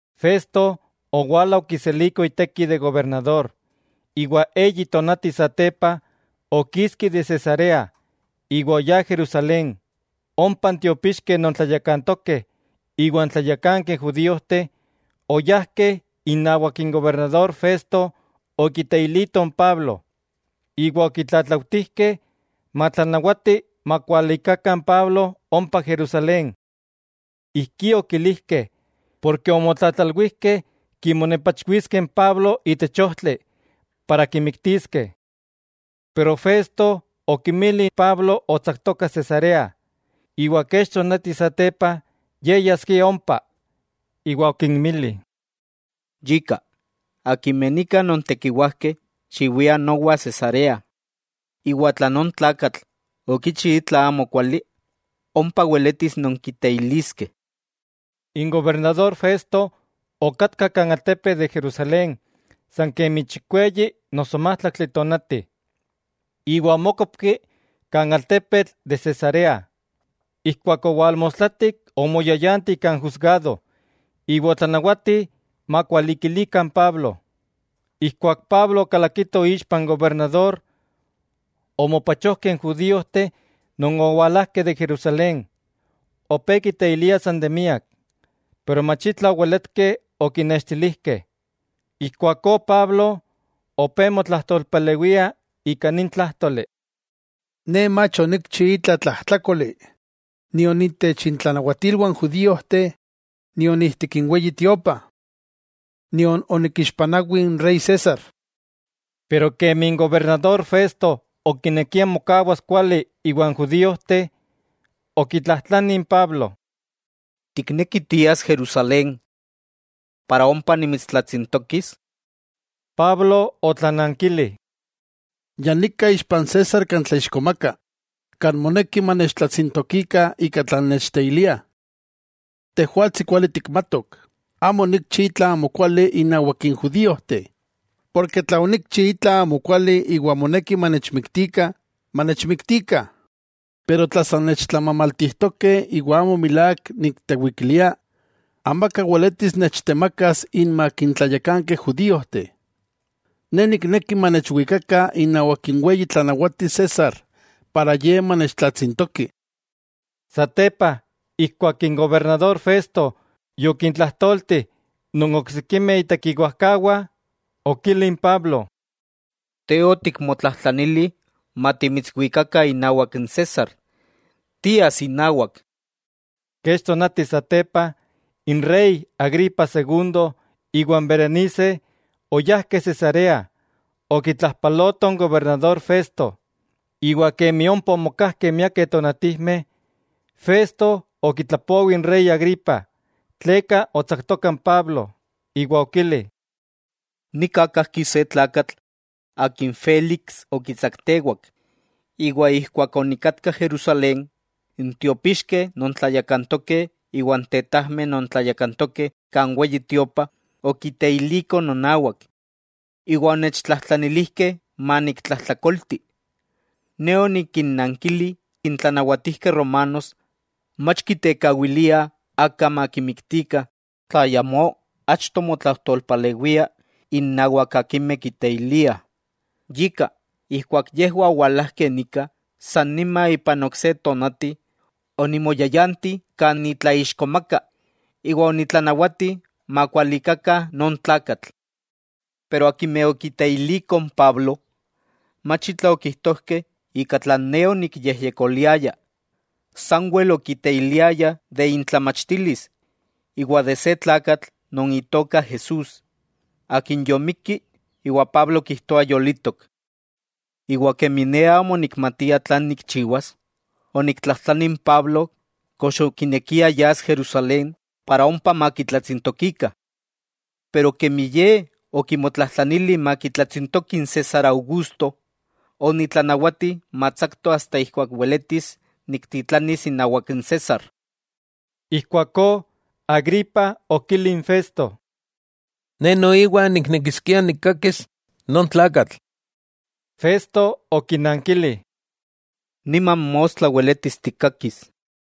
Festo owala okiseliko iteki de gobernador, iwa eyi tonati satepa okiski de Cesarea iwa oyá Jerusalén. Ompa n tiopixkeh non tlayakantokeh iwa n tlayakankeh judíojteh oyajkeh inawak n gobernador Festo okiteilitoh n Pablo. Iwa okitlatlautijkeh matlanawati makualikakah n Pablo ompa Jerusalén. Ijkí okilijkeh porke omotlatlalwijkeh kimonepachwiskeh n Pablo itech ojtli para kimiktiskeh. Pero Festo okinmili Pablo otsaktoka Cesarea, iwa kech tonati satepa ye yaskia ompa. Iwa okinmili: —Yika, akimeh nika nontekiwajkeh xiwiah nowa Cesarea, iwa tla non tlakatl okichi itla amokuali, ompa weletis nonkiteiliskeh. N gobernador Festo okatka kan altepetl de Jerusalén san kemi chikweyi noso májtlaktli tonati, iwa omókopki kan altepetl de Cesarea. Ijkuak owalmostlatik omoyayanti kan jusgado, iwa otlanawati makualikilikah n Pablo. Ijkuak Pablo okalakito ixpa n gobernador, omopachojkeh n judíojteh non owalajkeh de Jerusalén. Opé kiteiliah san de miak, pero mach itla oweletkeh okinextilijkeh. Ijkuakó Pablo, opé motlajtolpalewia ika nin tlájtoli: —Ne mach onikchi itla tlajtlákoli, nion itech intlanawatilwah n judíojteh nion ijtik n Weyi Tiopa. Nion onikixpanawi n rey César. Pero kemi n gobernador Festo okinekia mokawas kuali iwan judíojteh, okitlajtlani n Pablo: —¿Tikneki tias Jerusalén para ompa nimitstlatsintokis? Pablo otlanankili: —Ya nika ixpa n César kan tlaixkomaka, kan moneki manechtlatsintokikah ika tlan nechteiliah. Tejwatsi kuali tikmatok, amo onikchi itla amokuali innawak n judíojteh. Porke tla onikchi itla amokuali iwa moneki manechmiktikah, ¡manechmiktikah! Pero tla san nechtlamamaltijtokeh iwa amo milák niktewikilia, amaka weletis nechtemakas inmak n tlayakankeh judíojteh. Ne nikneki manechwikakah inawak n weyi tlanawati César para ye manechtlatsintoki. Satepa ijkuak n gobernador Festo yokintlajtolti non oksikimeh itekiwajkawah, okili n Pablo: —Te otikmotlajtlanili matimitswikakah inawak n César. Tias inawak. Kech tonati satepa, n rey Agripa Segundo iwa n Berenice oyajkeh Cesarea okitlajpalotoh n gobernador Festo. Iwa kemi ompa omokajkeh miakeh tonatijmeh, Festo okitlapowi n rey Agripa tleka otsaktoka n Pablo, iwa okili: —Nika kajki se tlakatl akin Félix okitsaktewak. Iwa ijkuak onikatka Jerusalén, n tiopixkeh non tlayakantokeh iwa n tetajmeh non tlayakantokeh kan Weyi Tiopa okiteilikoh nonawak, iwa onechtlajtlanilijkeh maniktlajtlakolti. Ne onikinnankili n tlanawatijkeh romanos mach kitekawiliah aka makimiktikah tla ayamó achto motlajtolpalewia innawak akimeh kiteiliah. Yika, ijkuak yejwah owalajkeh nika, san nima ipan ok se tonati onimoyayanti kan nitlaixkomaka iwa onitlanawati makualikakah non tlakatl. Pero akimeh okiteilikoh n Pablo, mach itla okijtojkeh ika tlan ne onikyejyekoliaya. Sanwel okiteiliayah de intlamachtilis, iwa de se tlakatl non itoka Jesús, Akin yomikki iwa Pablo kijtoa yolitok. Iwa kemi ne amo onikmatia tlan nikchiwas, oniktlajtlani n Pablo kox okinekia yas Jerusalén para ompa makitlatsintokikah. Pero kemi ye okimotlajtlanili makitlatsintoki n César Augusto, onitlanawati matsakto asta ijkuak weletis niktitlanis inawak n César. Ijkuakó Agripa okili n Festo: —Ne noiwa niknekiskia nikkakis non tlakatl. Festo okinankili: —Niman mostla weletis tikkakis.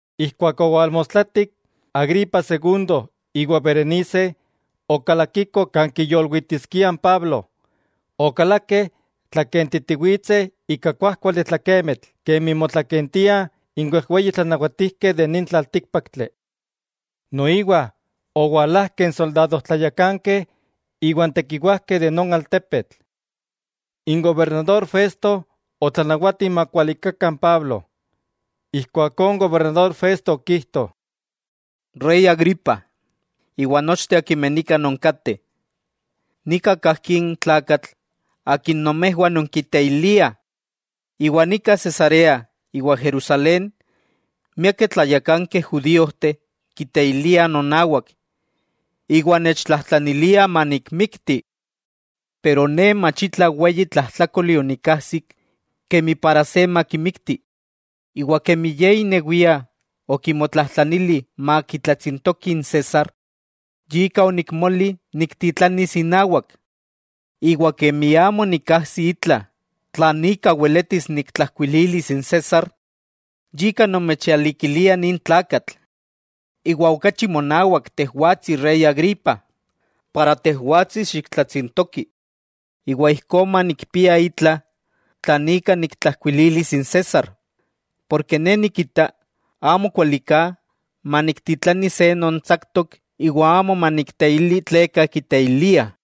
Ijkuak owalmostlatik, Agripa Segundo iwa Berenice okalakikoh kan kiyolwitiskiah n Pablo, okalakeh tlakentitiwitseh ika kuájkuali tlakemitl kemi motlakentiah n wejweyi tlanawatijkeh itech nin tlaltíkpaktli. Noiwa owalajkeh n soldado tlayakankeh iwa n tekiwajkeh de non altepetl. N gobernador Festo otlanawati makualikakah n Pablo. Ijkuakó n gobernador Festo okijto: —Rey Agripa, iwa nochteh akimeh nika nonkateh, nika kajki n tlakatl akin nomejwah nonkiteiliah. Iwa nika Cesarea iwa Jerusalén, miakeh tlayakankeh judíojteh kiteiliah nonawak, iwa nechtlajtlaniliah manikmikti. Pero ne mach itla weyi tlajtlákoli onikajsik kemi para se makimikti, iwa kemi ye inewia okimotlajtlanili makitlatsintoki n César, yika onikmoli niktitlanis inawak. Iwa kemi amo nikajsi itla tlan ika weletis niktlajkuililis n César, yika nomechalikilia nin tlakatl, iwa okachi monawak tejwatsi rey Agripa, para tejwatsi xiktlatsintoki iwa ijkó manikpia itla tlan ika niktlajkuililis n César. Porke ne nikita amo kuali ka maniktitlani se non tsaktok iwa amo manikteili tleka kiteiliah.